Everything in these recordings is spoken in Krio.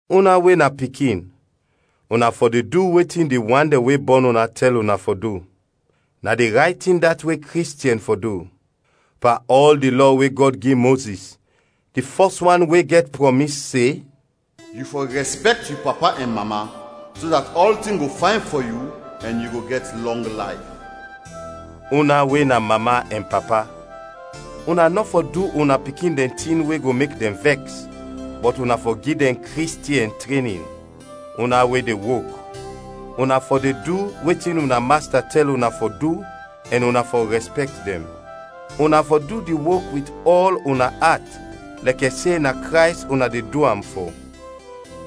Una we na pikin, una fɔ de du wetin di wan dɛn we bɔn una tɛl una fɔ du; na di rayt tin dat we Kristiɛn fɔ du. Pan ɔl di lɔ we Gɔd gi Mozis, di fɔs wan we gɛt prɔmis, se: “Yu fɔ rɛspɛkt yu papa ɛn mama, so dat ɔltin go fayn fɔ yu ɛn yu go gɛt lɔng layf.” Una we na mama ɛn papa, una nɔ fɔ du una pikin dɛn tin we go mek dɛn vɛks, bɔt una fɔ gi dɛn Kristiɛn trenin. Una we de wok, una fɔ de du wetin una masta tɛl una fɔ du, ɛn una fɔ rɛspɛkt dɛn. Una fɔ du di wok wit ɔl una at lɛkɛ se na Krays una de du am fɔ.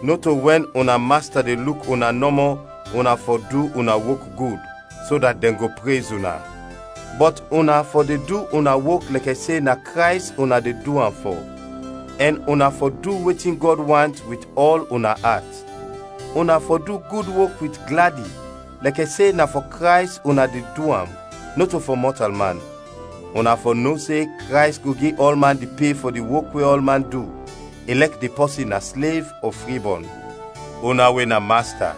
Nɔto wɛn una masta de luk una nɔmɔ una fɔ du una wok gud, so dat dɛn go prez una; bɔt una fɔ de du una wok lɛkɛ se na Krays una de du am fɔ, ɛn una fɔ du wetin Gɔd want wit ɔl una at. Una fɔ du gud wok wit gladi lɛkɛ se na fɔ Krays una de du am, nɔto fɔ mɔtalman. Una fɔ no se Krays go gi ɔlman di pe fɔ di wok we ɔlman du, ilɛk di pɔsin na slev ɔ fribɔn. Una we na masta,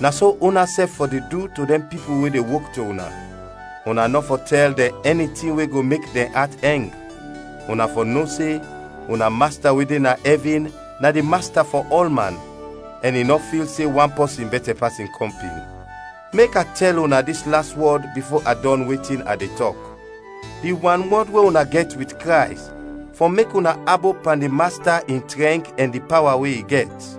na so unasɛf fɔ de du to dɛn pipul we de wok to una. Una nɔ fɔ tɛl dɛn ɛni tin we go mek dɛn at ɛng. Una fɔ no se una Masta we de na ɛvin na di Masta fɔ ɔlman ɛn i nɔ fil se wan pɔsin bɛtɛ pas in kɔmpin. Mek a tɛl una dis las wɔd bifo a dɔn wetin a de tɔk: Di wanwɔd we una gɛt wit Krays fɔ mek una abop pan di Masta in trɛnk ɛn di pawa we i gɛt.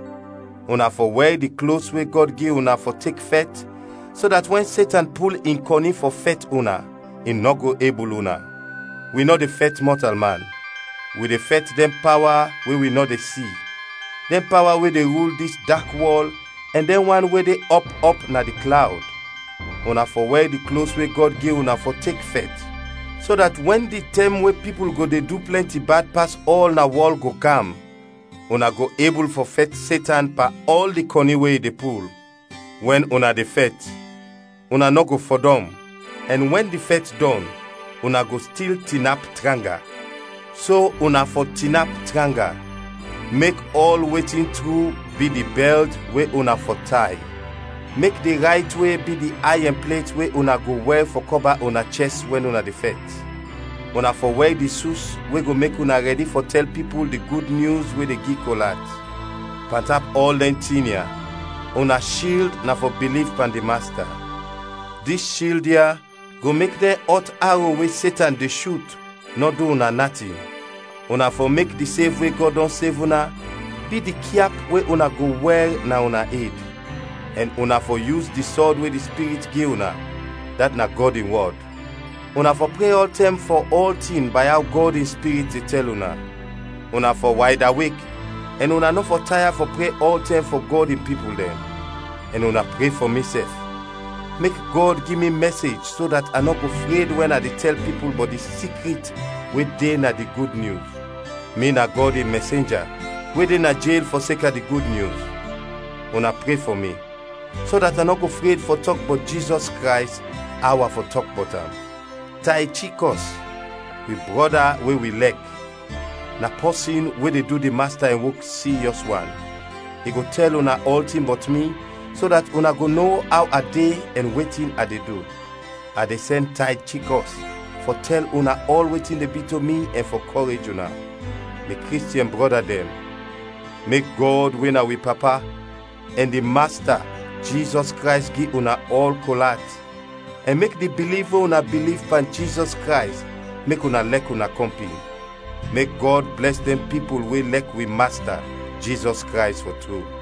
Una fɔ wɛr di klos we Gɔd gi una fɔ tek fɛt so dat wɛn Setan pul in kɔni fɔ fɛt una, i nɔ go ebul una. Wi nɔ de fɛt mɔtalman, wi de fɛt dɛn pawa we wi nɔ de si, dɛn pawa we de rul dis dak wɔl ɛn dɛn wan we de ɔp ɔp na di klawd. Una fɔ wɛr di klos we Gɔd gi una fɔ tek fɛt, so dat wɛn di tɛm we pipul go de du plɛnti bad pas ɔl na wɔl go kam, una go ebul fɔ fɛt Setan pan ɔl di kɔni we i de pul. Wɛn una de fɛt, una nɔ go fɔdɔm, ɛn wɛn di fɛt dɔn, una go stil tinap tranga. So una fɔ tinap tranga: mek ɔl wetin tru bi di bɛlt we una fɔ tay; mek di rayt-we bi di ayɛn plet we una go wɛr fɔ kɔba una chɛst wɛn una de fɛt. Una fɔ wɛr di sus we go mek una rɛdi fɔ tɛl pipul di Gud Nyus we de gi kol at. Pantap ɔl dɛn tin ya, una shild na fɔ biliv pan di Masta. Dis shild ya go mek dɛn ɔt aro we Setan de shut, nɔ du una natin. Una fɔ mek di sev we Gɔd dɔn sev una, bi di kyap we una go wɛr na una ed; ɛn una fɔ yus di sɔd we di Spirit gi una, dat na Gɔd in wɔd. Una fɔ pre ɔltɛm fɔ ɔltin bay aw Gɔd in Spirit de tɛl una. Una fɔ waydawek ɛn una nɔ fɔ taya fɔ pre ɔltɛm fɔ Gɔd in pipul dɛn. Ɛn una pre fɔ misɛf, mek Gɔd gi mi mɛsej so dat a nɔ go fred wɛn a de tɛl pipul bɔt di sikrit we de na di Gud Nyus. Mi na Gɔd in mɛsenja we de na jel fɔseka di Gud Nyus. Una pre fɔ mi, so dat a nɔ go fred fɔ tɔk bɔt Jizɔs Krays aw a fɔ tɔk bɔt am. Taychikɔs, wi brɔda we wi lɛk, na pɔsin we de du di Masta in wok siryɔs wan. I go tɛl una ɔltin bɔt mi, so dat una go no aw a de ɛn wetin a de du. A de sɛn Taychikɔs fɔ tɛl una ɔl wetin de bi to mi ɛn fɔ kɔrej una. Mi Kristiɛn brɔda dɛn, mek Gɔd we na wi Papa ɛn di Masta, Jizɔs Krays gi una ɔl kol at, ɛn mek di biliv we una biliv pan Jizɔs Krays mek una lɛk una kɔmpin. Mek Gɔd blɛs dɛn pipul we lɛk wi Masta, Jizɔs Krays fɔ tru.